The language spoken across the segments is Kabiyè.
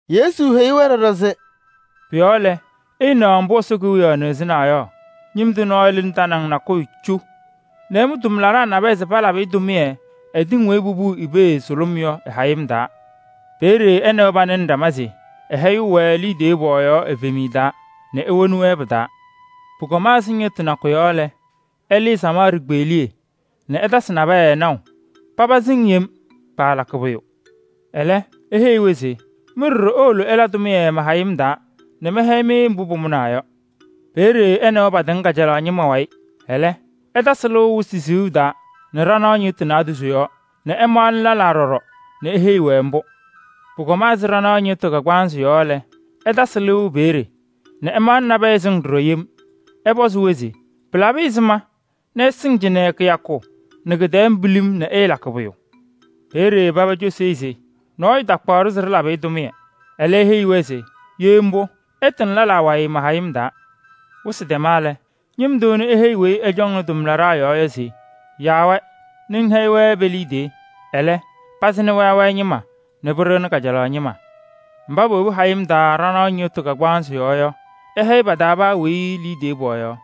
Yesu heyi-wɛ ɖɔɖɔ se: “Pʋ-yɔɔ lɛ, ɩɩnaɣ mbʋ Ɛsɔ Kewiyaɣ nɩɣzɩnaa yɔ: ñɩm tʋ nɔɔyʋ lɩnɩ tanaŋ nakʋyʋ cu nɛ ɛmʋ tʋmlaɖaa nabɛyɛ se palabɩ-ɩ tʋmɩyɛ ɛ-tɩŋ weyi popuʋ i-pee sʋlʋm yɔ ɩ-hayɩm taa. Peeye ɛ nɛ wɛ panɩnɩ ɖama se ɛhɛyɩɣ-wɛ liidiye pɔɔyaɣ pɔɔyaɣ evemiye taa nɛ ewoni-wɛ pɩ-taa. Pʋkɔma ɛzɩ ñɩɣtʋ nakʋ yɔ lɛ, ɛlɩɩ samaɣ ɖikpeɣliye nɛ ɛtasɩ nabɛyɛ naʋ, paba sɩŋ yem, paalakɩ pʋyʋ. Ɛlɛ eheyi-wɛ se: ‘Mɩ ɖɔɖɔ iwolo ɩla tʋmɩyɛ ma-hayɩm taa nɛ mɛhɛyɩ-mɩ mbʋ pʋmʋnaa yɔ.’ Peeye ɛ nɛ wɛ patɩŋ kajalaɣ ñɩma wayɩ. Ɛlɛ ɛtasɩ lɩʋ wɩsɩ siɣu taa nɛ ɖanaɣ ñɩɣtʋ naadozo yɔɔ nɛ ɛmaɣnɩ lɛlaa ɖɔɖɔ nɛ eheyi-wɛ mbʋ. Pʋkɔma ɛzɩ ɖanaɣ ñɩɣtʋ kagbaanzɩ yɔ lɛ, ɛtasɩ lɩʋ peeye nɛ ɛmaɣnɩ nabɛyɛ sɩŋ ɖɔɖɔ yem. Ɛpɔzɩ-wɛ se: ‘Pɩlabɩ ɛzɩma nɛ ɩsɩŋ cɩnɛ kɩyakʋ nɛ kɩ-tɛɛ pilim nɛ ɩɩlakɩ pʋyʋ?’ Peeye paba cosi-i se: ‘Nɔɔyʋ takpaɣ-ɖʋ se ɖɩlabɩ-ɩ tʋmɩyɛ.’ Ɛlɛ eheyi-wɛ se: ‘Ye mbʋ, ɩtɩŋ lɛlaa wayɩ ma-hayɩm taa.’ “Wɩsɩ tɛma lɛ, ñɩm tʋ ɛnʋ eheyi weyi ɛcɔŋnɩ tʋmlaɖaa yɔɔ yɔ se: ‘Yaa-wɛ nɛ ŋhɛyɩ-wɛ pe-liidiye. Ɛlɛ, pazɩnɩ wayɩ wayɩ ñɩma nɛ pɩɖɩɣnɩ kajalaɣ ñɩma.’ Mba powobi hayɩm taa ɖanaɣ ñɩɣtʋ kagbaanzɩ yɔɔ yɔ, ɛhɛyɩ paa pa-taa weyi liidiye pɔɔyaɣ.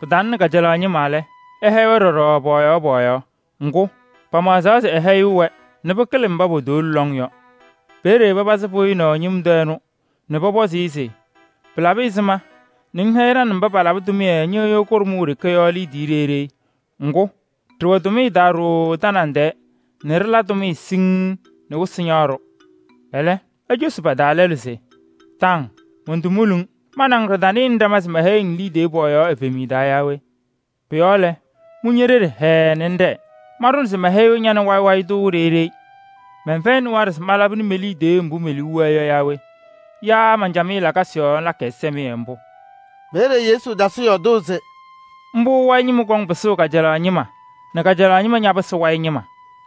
Pɩtalɩnɩ kajalaɣ ñɩma lɛ, ɛhɛyɩ-wɛ ɖɔɖɔ pɔɔyaɣ pɔɔyaɣ. Ŋgʋ, pamaɣzaɣ se pɛhɛyɩɣ-wɛ nɛ pɩkɩlɩ mba potowolo lɔŋ yɔ. Peeye papazɩ pɩɣyɩnaʋ ñɩm tʋ ɛnʋ nɛ pɔpɔzɩ-ɩ se: ‘Pɩlabɩ ɛzɩma nɛ ŋhɛyɩ ɖa nɛ mba palabɩ tʋmɩyɛ ñɩɣyʋ kʋɖʋm ɖeke yɔ liidiye ɖeyi ɖeyi? Ŋgʋ, ɖɛwɛnɩ tʋmɩyɛ taa ɖooo tanaŋ tɛɛ nɛ ɖɩla tʋmɩyɛ siŋŋ nɛ wɩsɩ ñaɣ-ɖʋ!’ Ɛlɛ, ecosi pa-taa lɛlʋ se: ‘Taŋ! Montomuli-ŋ. Ma nɛ ŋ ɖɩtanɩnɩ ɖama se mɛhɛyɩɣ-ŋ liidiye pɔɔyaɣ evemiye taa yaa we? Pʋ-yɔɔ lɛ, mʋ ñe-ɖeɖe hɛɛɛ nɛ ŋɖɛɛ. Manɖʋna se mɛhɛyɩɣ ña nɛ wayɩ wayɩ tʋ ɖeyi ɖeyi. Mɛnfɛyɩnɩ waɖɛ se malabɩnɩ me-liidiye mbʋ me-liu wɛɛ yɔ yaa we? Yaa man-camɩyɛ lakasɩ yɔɔ ŋlakɩ ɛzɩsɛmɩyɛ mbʋ?’” Peeye Yesu tasɩ yɔɔdʋʋ se: “Mbʋ wayɩ ñɩma kɔŋ pɩsʋʋ kajalaɣ ñɩma nɛ kajalaɣ ñɩma ñapɩsɩ wayɩ ñɩma.”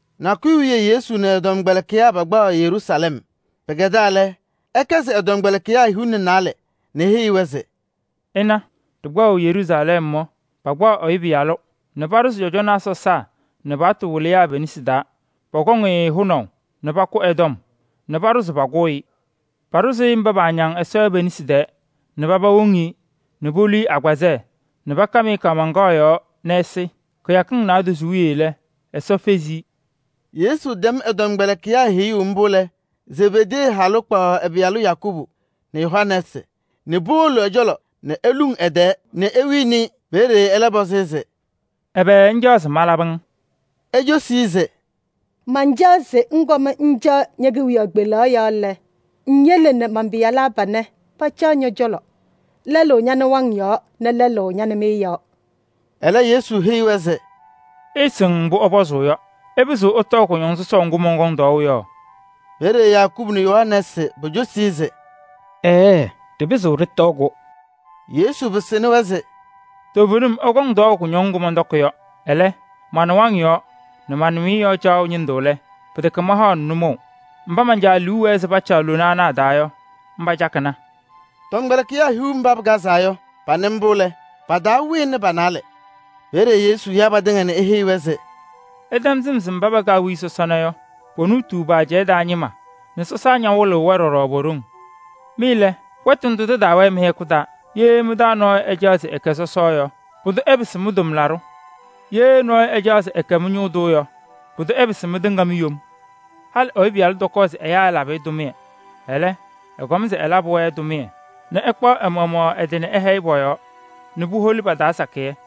Nakʋyʋ wiye Yesu nɛ ɛ-tɔmkpɛlɩkɩyaa pakpaɣaɣ Yeruusalɛm. Pɩkɛdaa lɛ, ɛkɛsɩ ɛ-tɔmkpɛlɩkɩyaa hiu nɛ naalɛ nɛ eheyi-wɛ se: “Ɩna, ɖɩkpaɣʋ Yeruusalɛm yɔ, pakpaɣ Ɛyʋ Pɩyalʋ nɛ paɖʋzɩ cɔjɔnaa sɔsaa nɛ paɣtʋ wɩlɩyaa pe-nesi taa. Pɔkɔŋ-ɩ hʋnaʋ nɛ pakʋ ɛ-tɔm nɛ paɖʋ se pakʋ-ɩ. Paɖʋzʋʋ-ɩ mba paañaŋ Ɛsɔ yɔ pe-nesi taa nɛ paba woŋ-i nɛ polu-i agbazɛɛ nɛ pakam-ɩ kaamaŋkaɣ yɔɔ nɛ ɛsɩ. Kɩyakɩŋ naadozo wiye lɛ, Ɛsɔ fezi-i.” Yesu tɛm ɛ-tɔmkpɛlɩkɩyaa heyuu mbʋ lɛ, Zebedee halʋ kpaɣ ɛ-pɩyalaa Yakubu nɛ Yohanɛɛsɩ nɛ powolo ɛ-cɔlɔ nɛ eluŋ ɛ-tɛɛ nɛ ewini-i. Peeye ɛlɛ pɔzɩ-ɩ se: “Ɛbɛ ŋcaɣ se malabɩ-ŋ?” Ecosi-i se: “Mancaɣ se ŋkɔm ŋcaɣ ñe-kewiyaɣ kpelaɣ yɔɔ lɛ, ŋyele nɛ man-pɩyalaa panɛ pacaɣ ñɔ-cɔlɔ: lɛlʋ ña-nɩwaŋ yɔɔ nɛ lɛlʋ ña-nɩmɩyɛ yɔɔ.” Ɛlɛ, Yesu heyi-wɛ se: “Ɩɩsɩŋ mbʋ ɩsʋlʋmʋʋ yɔ. Ɩpɩzɩɣ ɩtɔɔ kʋñɔŋ sɔsɔʋ ŋgʋ mɔnkɔŋ tɔɔʋ yɔ?” Peeye Yakubu nɛ Yohanɛɛsɩ pocosi-i se: “Ɛɛɛ! Ɖɩpɩzɩɣ ɖɩtɔɔ-kʋ.” Yesu pɩsɩnɩ-wɛ se: “Toovenim ɩkɔŋ tɔɔʋ kʋñɔŋ ŋgʋ mɔntɔkɩ yɔ. Ɛlɛ, ma-nɩwaŋ yɔɔ nɛ ma-nɩmɩyɛ yɔɔ caɣʋ ñɩndʋ lɛ, pɩtɛkɛ mahaɣnɩ nʋmɔʋ. Mba man-Caa liu wɛɛ se pacaɣ lona ana a-taa yɔ, mba cakɩna.” Tɔmkpɛlɩkɩyaa hiu mba pɩkazaa yɔ, panɩ mbʋ lɛ, pa-taa wɩnɩ pa-naalɛ. Peeye Yesu ya patɩŋa nɛ eheyi-wɛ se: “Ɩtɛm sɩm se mba pɛkɛ awiya sɔsɔna yɔ, ponuutuu pa-ajɛɛ taa ñɩma nɛ sɔsaa ñawɩlɩɣ-wɛ ɖɔɖɔ po-ɖoŋ. Mɩ lɛ, wɛtʋ ndʋ tɩtaawɛɛ mɩ-hɛkʋ taa. Ye mɩ-taa nɔɔyʋ ɛcaɣ se ɛkɛ sɔsɔ yɔ, pʋdʋ ɛpɩsɩ mɩ-tʋmlaɖʋ. Ye nɔɔyʋ ɛcaɣ se ɛkɛ mɩ-ñʋʋ tʋ yɔ, pʋdʋ ɛpɩsɩ mɩtɩŋa mi-yom. Halɩ Ɛyʋ Pɩyalʋ tɔkɔɔ se ɛyaa ɛlabɩ-ɩ tʋmɩyɛ. Ɛlɛ, ɛkɔma se ɛlabɩ-wɛ tʋmɩyɛ nɛ ɛkpaɣ ɛ-maɣmaɣ ɛ-tɩ ɛhɛyɩ pɔ-yɔɔ nɛ puholi pa-taa sakɩyɛ.”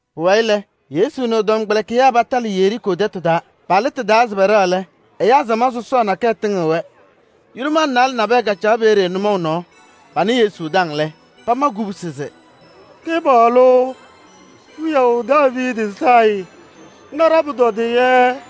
Pʋwayɩ lɛ, Yesu nɛ ɛ-tɔmkpɛlɩkɩyaa patalɩ Yeriikoo tɛtʋ taa. Palɩ tɩ-taa se pɛɖɛɣ lɛ, ɛyaa samaɣ sɔsɔɔ nakɛyɛ tɩŋɩɣ-wɛ. Yʋlʋmaa naalɛ nabɛyɛ kacaɣ peeye nʋmɔʋ nɔɔ. Panɩ Yesu taŋ lɛ, pama kubusi se: “Kɩpaɣlʋ, wiyaʋ Daaviidi sayɩ! Na ɖa-pʋtɔdɩyɛ.”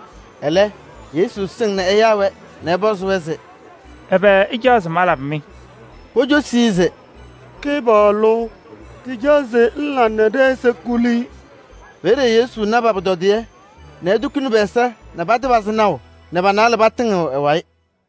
Ɛlɛ, Yesu sɩŋ nɛ ɛyaa-wɛ nɛ ɛpɔzɩ-wɛ se: “Ɛbɛ ɩcaɣ se malabɩ-mɩ?” Pocosi-i se: “Kɩpaɣlʋ! Ɖɩcaɣ se ŋla nɛ ɖɛ-ɛza kuli.” Peeye Yesu na pa-pʋtɔdɩyɛ nɛ etukuni pɛ-ɛza nɛ patɩpazɩ naʋ nɛ pa-naalɛ patɩŋɩɣ ɛ-wayɩ.